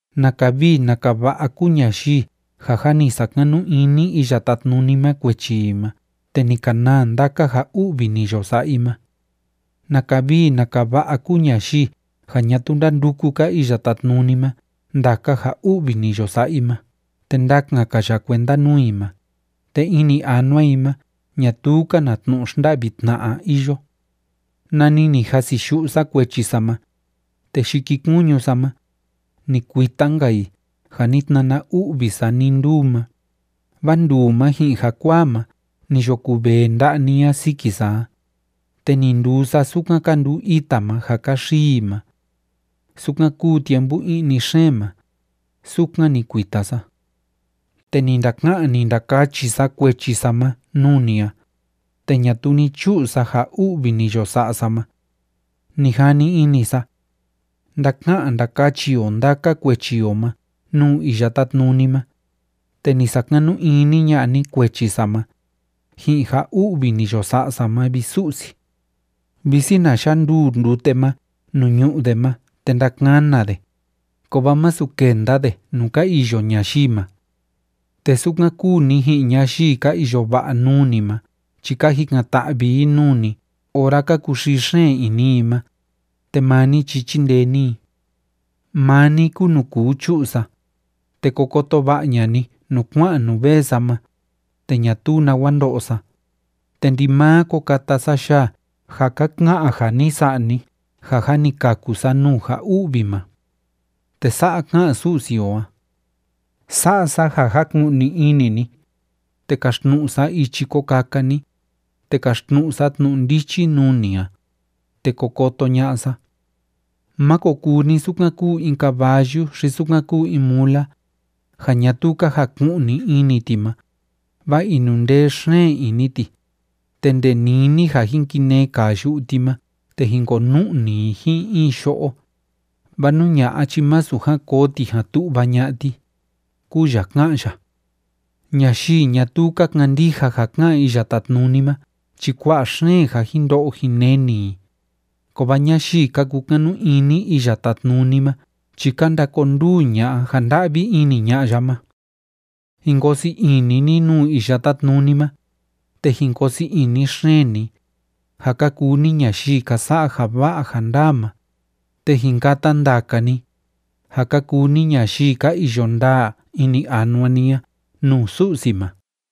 ¡Naka vii naka va'a kúu ñayii ja jâ ni sakanu ini Iya Tátnuni ma kuechi i ma te ni ka naa ndaka ja u'vi ni yo sa'a i ma! ¡Naka vii naka va'a kúu ñayii ja ñatuu ndánduku‑ka Iya Tátnuni ma ndaka ja u'vi ni yo sa'a i ma te ndakan‑ka ya kuenda nuu i ma, te ini anua i ma ñatuu‑ka na tnu'u xnda'vi tna'a iyo! Nani ni jasiyu'u sa kuechi sa ma, te yikikuñu sa ma, ni kuita‑nka i ja ni tnana u'vi sa nii nduu ma, vaa nduu ma ji'in jakuaa ma ni yo kuvee nda'a ni a siki sa a, te ni nduu sa sukan ka nduu ita ma ja ka xii i ma. Sukan kúu tiempu i'ni xeen ma, sukan ni kuita sa. Te ni ndaka'an ni ndakachi sa kuechi sa ma nuu ni a, te ñatuu ni chu'u sa ja u'vi ni yo sa'a sa ma. Ni jani ini sa: “Ndáka'an ndákachi o ndaka kuechi o ma nuu Iya Tátnuni ma”, te ni sakanu ini ña'a ni kuechi sa ma, ji'in ja u'vi ni yo sa'a sa ma, vi Su'si. Visi na yanduu ndute ma nuu ñu'u de ma te ndakana de, kovaa masu kenda de nuu ka iyo ñayii ma. Te sukan kúu ni ji'in ñayii ka iyo va'a nuu ni ma chi ka jikan‑ta'vi i nuu ni ora ka kuxii xeen ini i ma, te maa ni chi chíndee ni i. Maa ni kúu nuu kuu chu'u sa, te ko koto va'a ña'a ni nuu kua'an nuu vee sa ma, te ñatuu nawa ndo'o sa, te ndimaa ko kata sa yaa ja ka ka'an ja ni sa'a ni ja jâ ni kaku sa nuu ja u'vi ma. Te sa'a ká'an Su'si o a: “Sa'a sa ja jaku'ni ini ni, te kaxtnu'u sa ichi ko kaka ni, te kaxtnu'u sa tnu'u ndichi nuu ni a, te ko koto ña'a sa. Máko kuu ni sukan kúu in caballu xi sukan kúu in mula, ja ñatuu ka jaku'ni ini ti ma, vaa inundee xeen ini ti, te nde nini ja jin kinee kaa yu'u ti ma te jin konu'ni i ji'in in yo'o, vaa nú ña'a chi másu jan koo ti jan tu'va ña'a ti”, kúu ya ká'an ya. Ñayii ñatuu ka kandija ja ká'an Iya Tátnuni ma chi kua'a xeen ja jin ndo'o jin neni i, kovaa ñayii ka kukanu ini Iya Tátnuni ma chi ka ndakonduu ña'a ja nda'vi ini ña'a ya ma. Jin koo sii ini ni nuu Iya Tátnuni ma, te jin koo sii ini xeen ni, ja ka kuu ni ñayii ka sa'a ja va'a ja ndaa ma, te jin kata ndaka ni, ja ka kuu ni ñayii ka iyo ndaa ini anua ni a nuu Su'si ma.